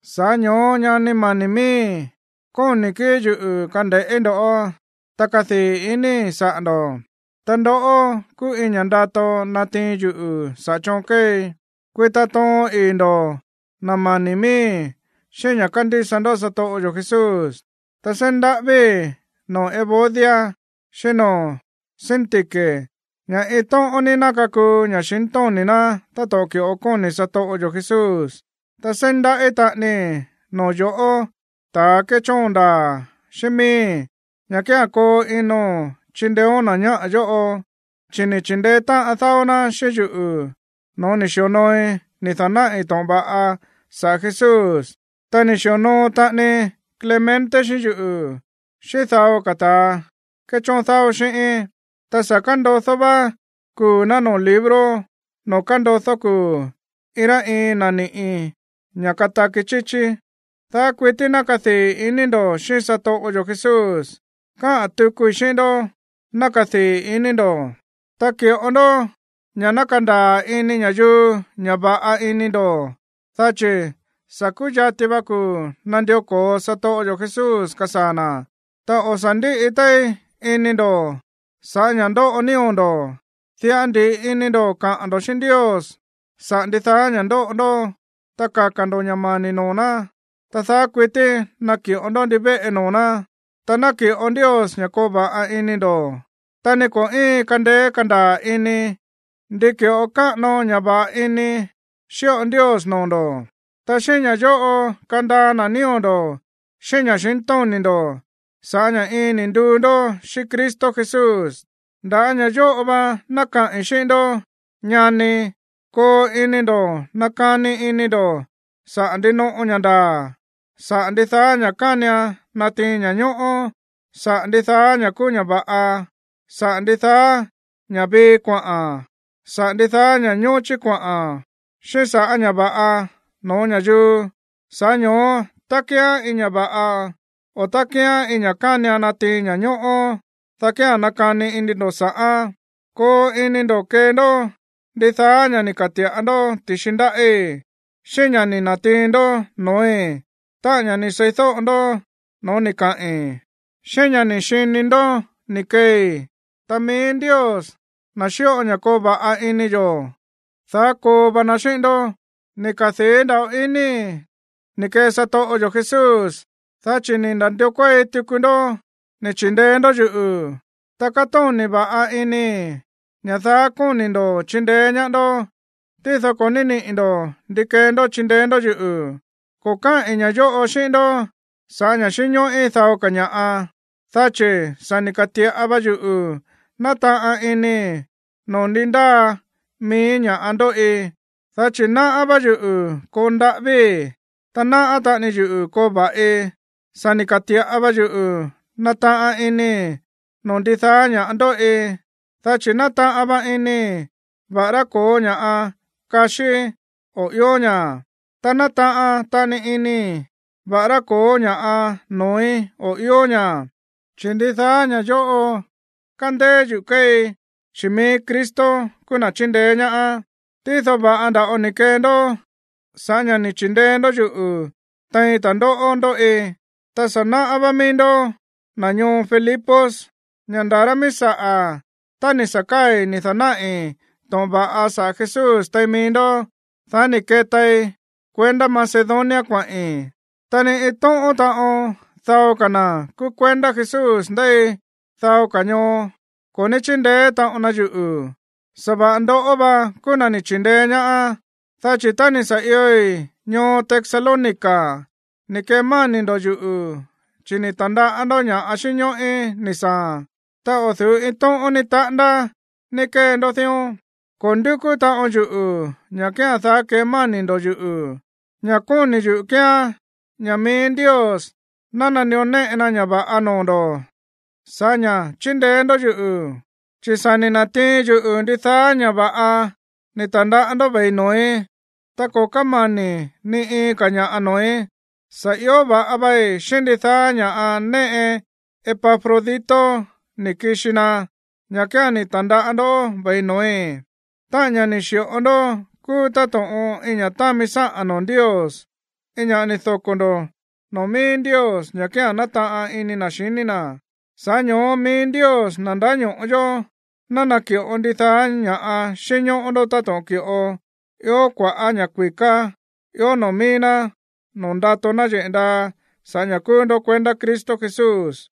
Sa̱ꞌá ño̱ó, ñani mani̱ miíi̱, kóni̱ kíi̱ yuꞌu̱ kande̱ꞌí ndoꞌó. Ta kádii̱ inii̱ saꞌa̱ ndo̱, ta ndoꞌó kúú iin ña̱ ndato natiin yuꞌu̱ saꞌa̱ choon kéei. Kuita toon ii̱ ndo̱, na̱ mani̱ miíi̱, xíꞌín ña̱ kándísa ndó satoꞌo yo̱ Jesús. Ta seí ndaꞌávíi̱ noo̱ Evodia, xíꞌín noo̱ Síntique ña̱ iin tóꞌón ní ná kakuu ña̱xintóni̱ ná táto̱ꞌon ki̱ꞌo kóni̱ satoꞌo yo̱ Jesús. Ta seí ndaꞌí taꞌanii noo̱ yo̱ꞌó, ta̱ kéchóon ndaa̱ xíꞌín miíi̱, ña̱ kía̱n koo ino̱n chindeéón na̱ ñáꞌa̱ yóꞌo, chi̱ ni̱ chi̱ndeé táꞌan dáó ná xíꞌín yuꞌu̱ no̱ó ni̱ xi̱onooi ni̱ da̱náꞌi̱ to̱ꞌon va̱ꞌa sa̱ꞌá Jesús. Ta ni̱ xi̱onoo taꞌani Clemente xíꞌín yuꞌu̱, xíꞌín dao ka̱ ta̱a kéchóon dáó xíꞌíín. Ta sa̱ kándodó vá kuu̱ ná noo̱ libro noo̱ kándodó kuu̱ iin rá iin na̱ niꞌi̱ ña̱ kataki chíchí. Daá kuití ná kadii̱ ini ndo̱ xíꞌín satoꞌo yo̱ Jesús. Káꞌa̱n tukui xíꞌín ndó, ná kadii̱ ini ndo̱. Ta ki̱ꞌo ndó ña̱ ná kandaa̱ ini ña̱yuu ña̱ va̱ꞌa ini ndo̱, dá chi̱ sa̱ kúyati va kuu̱ nandió ko̱o satoꞌo yo̱ Jesús, kasaa̱ na̱. Ta o̱ sa̱ ndíꞌi téí ini ndo̱ sa̱ꞌá ña̱ ndóꞌo nío̱ ndo̱. Diꞌa ndi̱ꞌi ini ndo̱ kaꞌa̱n ndo̱ xíꞌín Ndios saꞌa̱ ndidaá ña̱ ndóꞌo ndó, ta kaka̱ ndo̱ ña̱ mani̱ noo̱ ná, ta daá kuití naki̱ꞌo ndó ndivéꞌe noo̱ ná. Ta naki̱ꞌo Ndios ña̱ koo va̱ꞌa ini ndo̱, ta ni ko̱ íin kandeé kandaa̱ ini ndi ki̱ꞌo káꞌano ña̱ va̱ꞌa ini xíꞌo Ndios noo̱ ndo̱. Ta xíꞌín ña̱ yóꞌo kandaa na̱ nío̱ ndo̱ xíꞌín ña̱xintóni̱ ndo̱ sa̱ꞌá ña̱ iin ni̱ nduu ndó xíꞌín Cristo Jesús. Nda̱á ña̱ yóꞌo va ná kaꞌi̱n xíꞌín ndó, ñanii̱. Koo ini ndo̱ nakani ini ndo̱ saꞌa̱ ndinoꞌo ña̱ ndaa̱, sa̱ꞌá ndidaá ña̱ kánian natiin ña̱ñóꞌó, saꞌa̱ ndidaá ña̱ kúú ña̱ va̱ꞌa, saꞌa̱ ndidaá ña̱ vii kuaꞌa̱n, saꞌa̱ ndidaá ña̱ ñóchí kuaꞌa̱n, xíꞌín sa̱ꞌá ña̱ va̱ꞌa no̱ó ña̱yuu. Sa̱ꞌá ño̱ó tá kíán iin ña̱ va̱ꞌa, o tá kíán iin ña̱ kánian natiin ña̱ñóꞌó, dá kía̱n nakani ini ndo̱ sa̱ꞌán. Koo ini ndo̱ kee ndó ndidaá ña̱ ni̱ ka̱ti̱ꞌa ndó ti̱xi ndáꞌí, xíꞌín ña̱ ni̱ na̱tiin ndó no̱ói̱, táꞌa̱n ña̱ ni̱ seídóꞌo ndó noo̱ ni̱ kaꞌi̱n, xíꞌín ña̱ ni̱ xini ndo̱ ni̱ keei. Ta mií Ndios, na̱ xíꞌo ña̱ koo va̱ꞌa ini yo̱, daá koo va na xíꞌín ndó. Ni̱ kadii̱ nda̱ꞌo inii̱ ni̱ kee satoꞌo yo̱ Jesús, dá chi̱ ni̱ na̱ndió kuéi tuku ndó ni̱ chi̱ndeé ndó yuꞌu̱. Ta kátóni̱ va̱ꞌa inii̱ ña̱ daá kóni̱ ndo̱ꞌó chindeé ñaá ndó, tído ko̱ ní níꞌi̱ ndo̱ ndi kee ndó chindeé ndó yuꞌu̱. Ko̱ káꞌi̱n ña̱ yóꞌo xíꞌín ndó sa̱ꞌá ña̱ xínñóꞌí dao ka̱ ña̱ꞌa, dá chi̱ sa̱ ni̱ ka̱ti̱ꞌa va yuꞌu̱ nátaꞌan inii̱ noo̱ ndi ndáa mií ña̱ ndóꞌi. Dá chi̱ náꞌá vá yuꞌu̱ koo ndaꞌávíi̱, ta náꞌá taꞌani yuꞌu̱ koo va̱ꞌi. Sa̱ ni̱ ka̱ti̱ꞌa va yuꞌu̱ nátaꞌan inii̱ no̱ó ndidaá ña̱ ndóꞌi, dá chi̱ nátaꞌan va inii̱ va̱ꞌará ko̱ó ña̱ꞌa kaxíí o ió ña̱, ta nátaꞌan taꞌani inii̱ va̱ꞌará ko̱ó ña̱ꞌa noo̱í o ió ña̱, chi̱ ndidaá ña̱ yóꞌo kándéé yuꞌu̱ kéei, chi̱ mií Cristo kúú na̱ chíndeé ñaá. Tído va̱ꞌa nda̱ꞌo ni̱ kee ndó sa̱ꞌá ña̱ ni̱ chi̱ndeé ndó yuꞌu̱ tein ta̱ndóꞌó ndóꞌi. Ta sa̱ náꞌá vá mií ndoꞌó, na̱ ñoo Filipos, ña̱ nda̱ rá mií saꞌa̱, tá ni̱ sa̱ káa̱i̱ ni̱ da̱náꞌi̱ to̱ꞌon va̱ꞌa saꞌa̱ Jesús tein mií ndó, dá ni̱ ketai kuendá Macedonia kuaꞌi̱n, ta ni iin tóꞌón taꞌon dao ka̱ na̱ kúú kuendá Jesús ndéi dao ka̱ ñoo ko̱ ní chíndeé taꞌon na yuꞌu̱, sa̱va̱ꞌa ndoꞌó va kúú na̱ ni̱ chi̱ndeé ñaá. Dá chi̱ tá ni̱ sa̱ ioi̱ ñoo Tesalónica ni̱ kemáni̱ ndo̱ yuꞌu̱, chi̱ ni̱ ta̱ndaꞌá ndó ña̱ xínñóꞌí ni̱ saa̱a̱n, ta o̱ du̱ú iin tóꞌón ni taꞌándá ni̱ kee ndó dión. Ko̱ ndúkú taꞌon yuꞌu̱ ña̱ kía̱n daá kemáni̱ ndo̱ yuꞌu̱. Ña̱ kóni̱ yuꞌu̱ kíán ña̱ mií Ndios ná nandió néꞌe na ña̱ va̱ꞌa noo̱ ndo̱ sa̱ꞌá ña̱ chíndeé ndó yuꞌu̱. Chi̱ sa̱ ni̱ na̱tiin yuꞌu̱ ndidaá vá ña̱ꞌa ni̱ ta̱ndaꞌá ndó ve̱i no̱ói̱, ta ko̱ kámani̱ ni iin ka̱ ña̱ꞌa no̱ói̱, sa̱ ió va̱ꞌa vei xíꞌín ndidaá ña̱ꞌa néꞌe Epafrodito ni̱ kixi na, ña̱ kía̱n ni̱ ta̱ndaꞌá ndó ve̱i no̱ói̱. Táꞌa̱n ña̱ ni̱ xi̱ꞌo ndó kúú táto̱ꞌon iin ña̱ támi sáꞌa̱n noo̱ Ndios, iin ña̱ ni̱ doko̱ ndo̱ noo̱ mií Ndios, ña̱ kía̱n nátaꞌan ini na̱ xiní na̱. Sa̱ꞌá ño̱ó mií Ndios, na̱ ndáño̱ꞌo yó, ná naki̱ꞌo ndidaá ña̱ xínñóꞌó ndó táto̱ꞌon ki̱ꞌo ió kua̱ꞌá ña̱ kui̱ká ió noo̱ mií ná noo̱ ndato náyeꞌe̱ ndaa sa̱ꞌá ña̱ kúú ndó kuendá Cristo Jesús.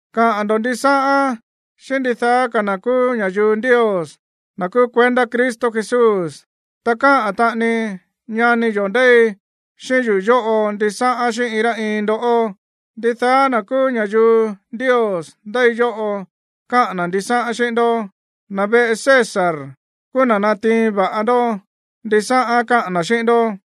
Kaꞌa̱n ndo̱ ndisáꞌán xíꞌín ndidaá ka̱ na̱ kúú ña̱yuu Ndios, na̱ kúú kuendá Cristo Jesús. Ta káꞌa̱n taꞌani ñani yo̱ ndéi xíꞌín yuꞌu̱ yóꞌo ndisáꞌán xíꞌín iin rá iin ndoꞌó. Ndidaá na̱ kúú ña̱yuu Ndios ndéi yóꞌo káꞌa̱n na̱ ndisáꞌán xíꞌín ndó, ta na̱ veꞌe César kúú na̱ natiin va̱ꞌa ndó ndisáꞌán káꞌa̱n na̱ xíꞌín ndó.